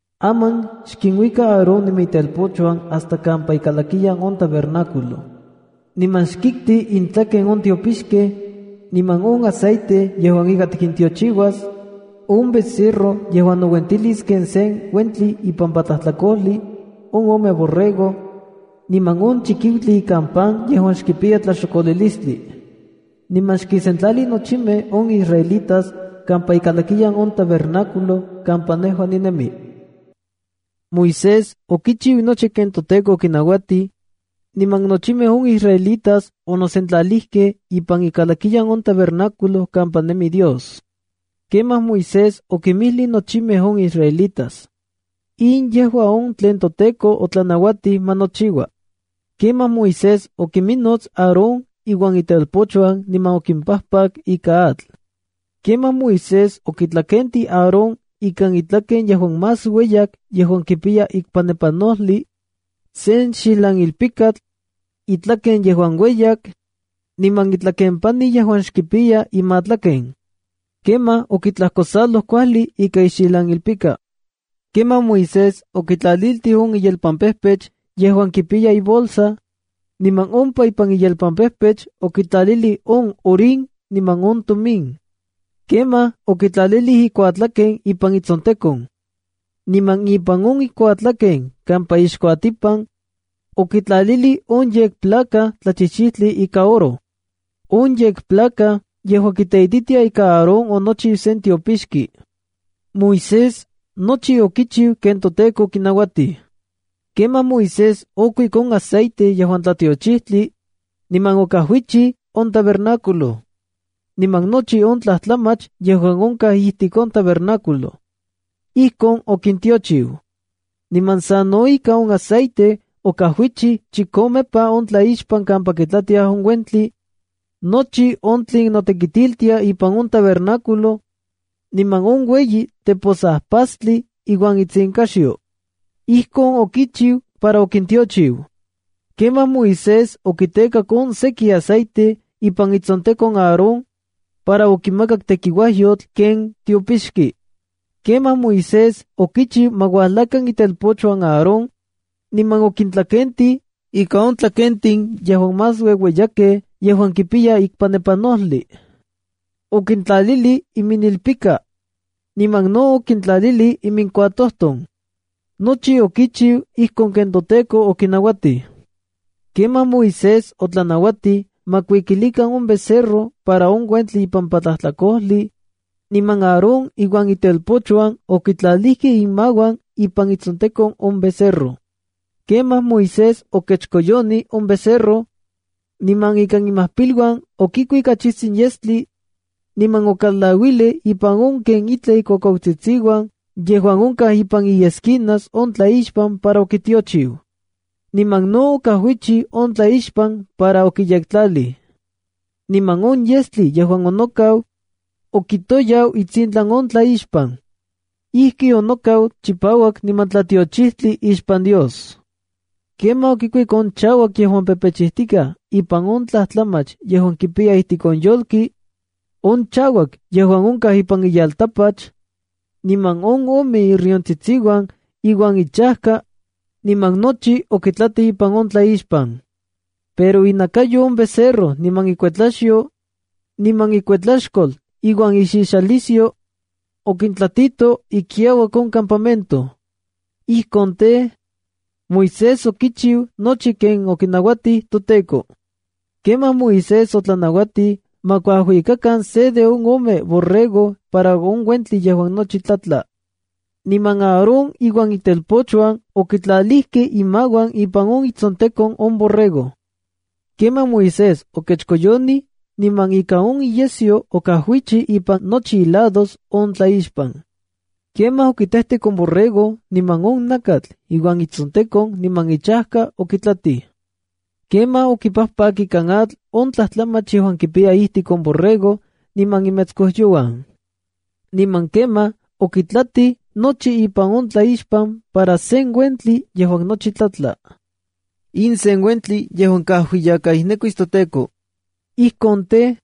“Aman xkinuika Aarón niman itelpochuan hasta kampa ikalakiyan on tabernáculo. Niman xkikti intlaken on tiopixkej, niman on aceite yejua ika tikintiochiuas, on becerro yejuan nouentilis ken se uentli ipampa tlajtlakojli, on ome borrego, niman on chikiutli ikan pan yejuan xkipiya tlaxokolilistli. Niman xkinsentlali nochimej on israelitas kampa ikalakiyan on tabernáculo kampa nejua ninemi.” Moisés okichiu nochi ken toTEKO okinauatij, niman nochimej on israelitas onosentlalijkej ipan ikalakiyan on tabernáculo kampa nemi Dios. Kemaj Moisés okinmijlij nochimej on israelitas: “In yejua on tlen toTEKO otlanauatij ma nochiua.” Kemaj Moisés okonminnots Aarón iuan itelpochuan niman okimpajpak ika atl. Kemaj Moisés okitlakentij Aarón ikan itlaken yejuan más ueyak yejuan kipiya ikpanepanojli, sen xijlanilpikatl, itlaken yejuan ueyak, niman itlakempani yejuan xkipiya imatlaken. Kemaj okitlajkosaloj kuajli ika ixijlanilpika. Kemaj Moisés okitlaliltij on iyelpampejpech yejuan kipiya ibolsa, niman ompa ipan iyelpampejpech okitlalilij on Urim niman on Tumim. Kemaj okitlalilij ikuatlaken ipan itsontekon. Niman ipan on ikuatlaken kampa ixkuatipan, okitlalilij on yekplaca tlachijchijtli ika oro. On yekplaca yejua kiteititia ika Aarón onochiu sen tiopixki. Moisés nochi okichiu ken toTEKO okinauatij. Kemaj Moisés okuik on aceite yejuan tlatiochijtli, niman okajuichi on tabernáculo, niman nochi on tlajtlamach yejuan onkaj ijtik on tabernáculo. Ijkon okintiochiu. Niman sa no ika on aceite okajuichij chikomepa on tlaixpan kampa kitlatiaj on uentli, nochi on tlen notekitiltia ipan on tabernáculo, niman on ueyi teposajpastli iuan itsinkaxyo. Ijkon okichiu para okintiochiu. Kemaj Moisés okitekak on seki aceite ipan itsontekon Aarón, para okimakak tekiuajyotl ken tiopixki. Kemaj Moisés okichiu ma uajlakan itelpochuan Aarón, niman okintlakentij ika on tlakentin yejuan más ueueyakej yejuan kipiya ikpanepanojli. Okintlalilij iminilpika, niman no okintlaliltij iminkuatojton. Nochi okichiu ijkon ken toTEKO okinauatij. Kemaj Moisés otlanauatij ma kuikilikan on becerro para on uentli ipampa tlajtlakojli, niman Aarón iuan itelpochuan okitlalijkej inmauan ipan itsontekon on becerro. Kemaj Moisés okechkoyonij on becerro, niman ikan imajpiluan okikuik achijtsin yestli, niman okalauilij ipan on ken itlaj ikuakuautsitsiuan yejuan onkaj ipan iesquinas on tlaixpan para okitiochiu. Niman no okajuichi on tlaixpan para okiyektlalij. Niman on yestli yejuan onokau, okitoyau itsintlan on tlaixpan. Ijki onokau chipauak niman tlatiochijtli ixpan Dios. Kemaj okikuik on chauak yejuan pepechijtikaj ipan on tlajtlamach yejuan kipiya ijtik on yolki, on chauak yejuan onkaj ipan iyeltapach, niman on ome iriontsitsiuan iuan ichajka, niman nochi okitlatij ipan on tlaixpan. Pero inakayo on becerro niman ikuetlaxyo, niman ikuetlaxkol iuan ixixalisyo, okintlatito ikiauak on campamento. Ijkon tej, Moisés okichiu nochi ken okinauatij toTEKO. Kemaj Moisés otlanauatij ma kuajuikakan se de on ome borrego para on uentli yejuan nochi tlatla. Niman Aarón iuan itelpochuan okitlalijkej inmauan ipan itsontekon on borrego. Kemaj Moisés okechkoyonij niman ikan on iyesyo okajuichi ipan nochi ilados on tlaixpan. Kemaj okitejtek on borrego niman on nakatl iuan itsontekon niman ichajka okitlatij. Kemaj okipajpak ikan atl on tlajtlamach yejuan kipiya ijtik on borrego niman imetskojyouan. Niman kemaj okitlatij nochi ipan on tlaixpan para sen uentli yejuan nochi tlatla. In sen uentli yejuan kajuiyakaijnekuis toTEKO. Ijkon tej,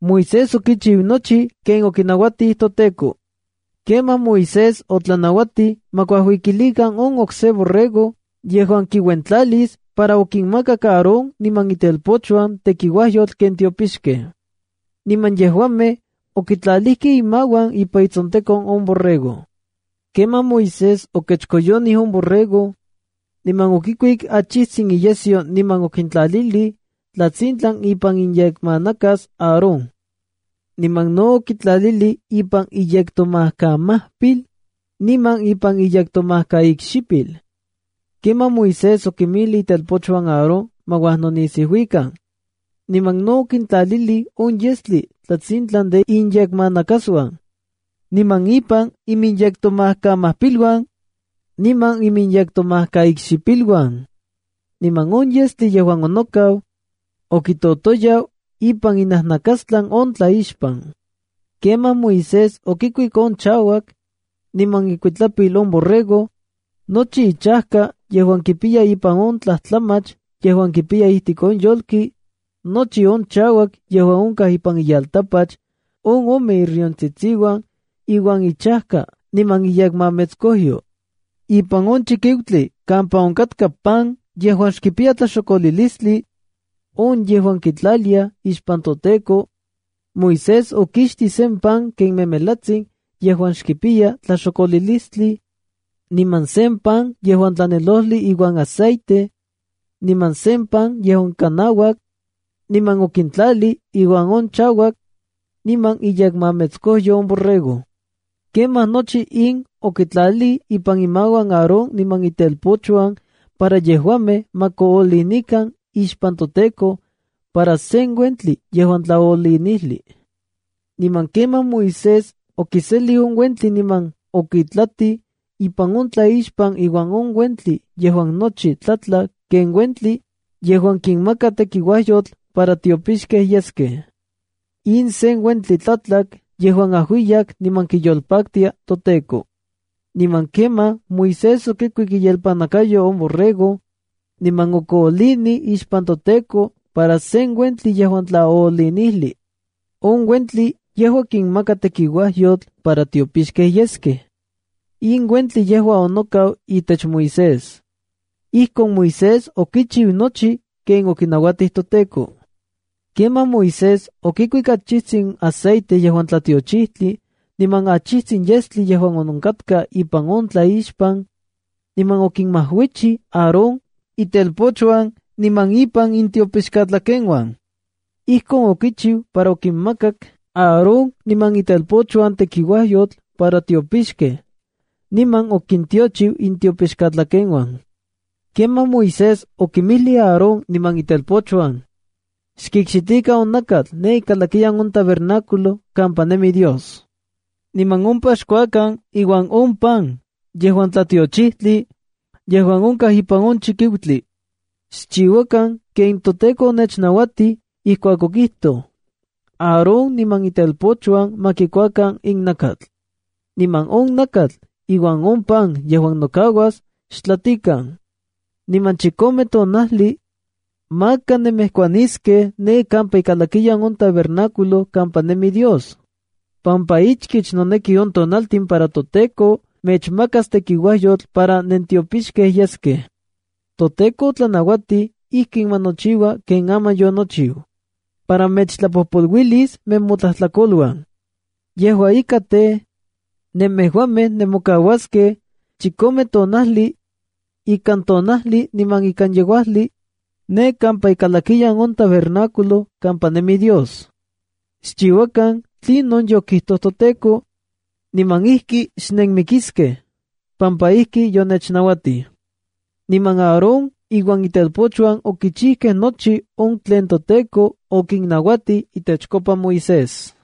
Moisés okichiu nochi ken okinauatij toTEKO. Kemaj Moisés otlanauatij ma kuajuikilikan on okse borrego yejuan kiuentlalis para okinmakak Aarón niman itelpochuan tekiuajyotl ken tiopixkej. Niman yejuamej okitlalijkej inmauan ipan itsontekon on borrego. Kemaj Moisés okechkoyonij on borrego, niman okikuik achijtsin iyesyo niman okitlalilij tlatsintlan ipan iyekmanakas Aarón. Niman no okitlalilij ipan iyektomajkamajpil, niman ipan iyektomajkaikxipil. Kemaj Moisés okinmijli itelpochuan Aarón ma uajnonisiuikan, niman no okintlalilij on yestli tlatsintlan de inyekmanakasuan, niman ipan iminyektomajkamajpiluan, niman iminyektomajkaikxipiluan. Niman on yestli yejuan onokau, okitotoyau ipan inajnakastlan on tlaixpan. Kemaj Moisés okikuik on chauak, niman ikuitlapil on borrego, nochi ichajka yejuan kipiya ipan on tlajtlamach yejuan kipiya ijtik on yolki, nochi on chauak yejuan onkaj ipan iyeltapach, on ome iriontsitsiuan iuan ichajka niman iyekmametskojyo. Ipan on chikiutli kampa onkatka pan yejuan xkipiya tlaxokolilistli, on yejuan kitlaliaj ixpan toTEKO, Moisés okixtij sen pan ken memelatsin yejuan xkipiya tlaxokolilistli, niman sen pan yejuan tlanelojli iuan aceite, niman sen pan yejuan kanauak, niman okintlalij iuan on chauak, niman iyekmametskojyo on borrego. Kemaj nochi in okitlalij ipan imauan Aarón niman itelpochuan para yejuamej ma koolinikan ixpan toTEKO para sen uentli yejuan tlaoolinijli. Niman kemaj Moisés okiselij on uentli niman okitlatij ipan on tlaixpan iuan on uentli yejuan nochi tlatla ken uentli yejuan kinmaka tekiuajyotl para tiopixkej yeskej. In sen uentli tlatlak yejuan ajuiyak niman kiyolpaktia toTEKO. Niman kemaj Moisés okikuik iyelpannakayo on borrego, niman okoolinij ixpan toTEKO para sen uentli yejuan tlaoolinijli. On uentli yejua kinmaka tekiuajyotl para tiopixkej yeskej. In uentli yejua onokau itech Moisés. Ijkon Moisés okichiu nochi ken okinauatij toTEKO. Kemaj Moisés okikuik achijtsin aceite yejuan tlatiochijtli niman achijtsin yestli yejuan onkatka ipan on tlaixpan, niman okinmajuichij Aarón, itelpochuan niman ipan intiopixkatlakeuan. Ijkon okichiu para okinmakak Aarón niman itelpochuan tekiuajyotl para tiopixkej, niman okintiochiu intiopixkatlakeuan. Kemaj Moisés okinmijli Aarón niman itelpochuan: “Xkikxitikan on nakatl ne ikalakiyan on tabernáculo kampa nemi Dios. Niman ompa xkuakan iuan on pan yejuan tlatiochijtli yejuan onkaj ipan on chikiutli. Xchiuakan ken toTEKO onechnauatij ijkuak okijtoj: ‘Aarón niman itelpochuan ma kikuakan in nakatl.’ Niman on nakatl iuan on pan yejuan nokauas, xtlatikan. Niman chikome tonajli, maka nenmejkuaniskej ne kampa ikalakiyan on tabernáculo kampa nemi Dios, pampa ichkich noneki on tonaltin para toTEKO mechmakas tekiuajyotl para nentiopixkej yeskej. ToTEKO otlanauatij ijkin ma nochiua ken aman yonochiu, para mechtlapojpoluilis nemotlajtlakoluan. Yejua ika, tej, nemejuamej nemokauaskej chikome tonajli, ikan tonajli niman ikan yeuajli, ne kampa ikalakiyan on tabernáculo kampa nemi Dios. Xchiuakan tlinon yokijtoj toTEKO, niman ijki xnenmikiskej, pampa ijki yonechnauatij.” Niman Aarón iuan itelpochuan okichijkej nochi on tlen toTEKO okinnauatij itechkopa Moisés.